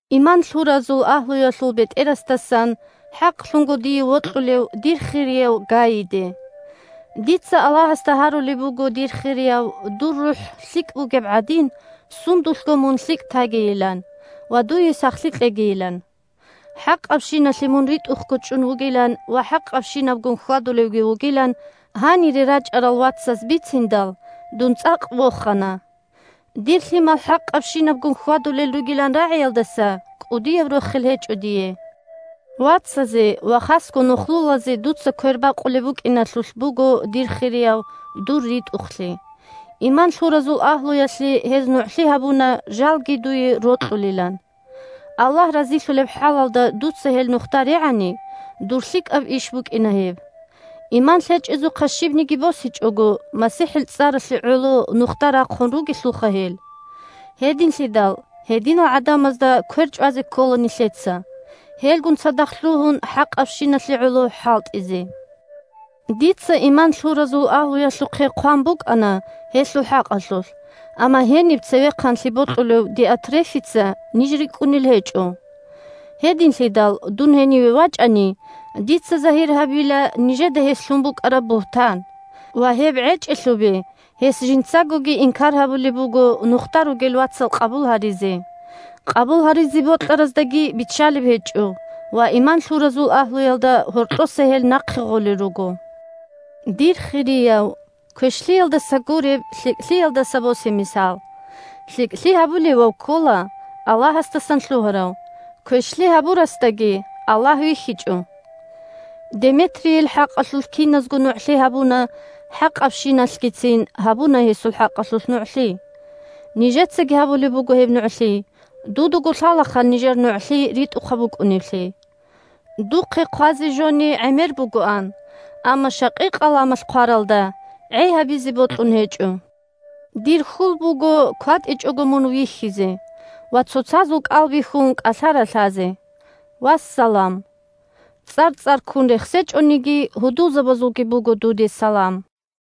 Иман лъуразул агьлуялъул бетӀерасдасан – хӀакълъунго дие вокьулев дир хирияв Гайиде. Дица Аллагьасда гьарулеб буго, дир хирияв, дур рухӀ лъикӀ бугеб гӀадин, сундулъго мун лъикӀ тагийилан ва дуе сахлъи кьегийилан. ХӀакъабщиналъе мун ритӀухъго чӀун вугилан ва хӀакъабщинабгун хьвадулевги вугилан гьанире рачӀарал вацаз бициндал, дун цӀакъ вохана. Дир лъимал хӀакъабщинабгун хьвадулел ругилан рагӀиялдаса кӀудияб рохел гьечӀо дие. Вацазе ва хасго нухлулазе дуца квербакъулеб букӀиналъулъ буго, дир хирияв, дур ритӀухълъи. Иман лъуразул агьлуялъе гьез нугӀлъи гьабуна жалги дуе рокьулилан. Аллагь разилъулеб хӀалалда дуца гьел нухда регӀани, дур лъикӀаб иш букӀина гьеб. Иман лъечӀезухъа щибниги босичӀого, МасихӀил цӀаралъе гӀоло нухда рахъун ругелъулха гьел. Гьединлъидал гьединал гӀадамазда квер чӀвазе ккола нилъеца, гьелгун цадахъ лъугьун хӀакъабщиналъе гӀоло хӀалтӀизе. Дица иман лъуразул агьлуялъухъе хъван букӀана гьелъул хӀакъалъулъ, амма гьениб цевехъанлъи бокьулев Диотрефица ниж рикӀкӀунел гьечӀо. Гьединлъидал, дун гьениве вачӀани, дица загьир гьабила нижеда гьес лъун букӀараб бугьтан. Ва гьеб гӀечӀелъубе, гьес жинцагоги инкар гьабулеб буго нухда ругел вацал къабул гьаризе, къабул гьаризе бокьараздаги биччалеб гьечӀо ва иман лъуразул агьлуялда гьоркьоса гьел нахъе гъолел руго. Дир хирияв, квешлъиялдаса гуреб, лъикӀлъиялдаса босе мисал. ЛъикӀлъи гьабулевав ккола Аллагьасдасан лъугьарав, квешлъи гьабурасдаги Аллагь вихьичӀо. Деметрийил хӀакъалъулъ киназго нугӀлъи гьабуна, хӀакъабщиналъгицин гьабуна гьесул хӀакъалъулъ нугӀлъи. Нижецаги гьабулеб буго гьеб нугӀлъи, дудаго лъалаха нижер нугӀлъи ритӀухъаб букӀунеблъи. Духъе хъвазе жони гӀемер бугоан, амма щакъи-къаламалъ хъваралда гӀей гьабизе бокьун гьечӀо. Дир хьул буго кватӀичӀого мун вихьизе ва, цоцазул кӀал бихьун, кӀалъа-ралъазе. Вассалам. ЦӀар-цӀарккун рехсечӀониги, гьудулзабазулги буго дуде салам.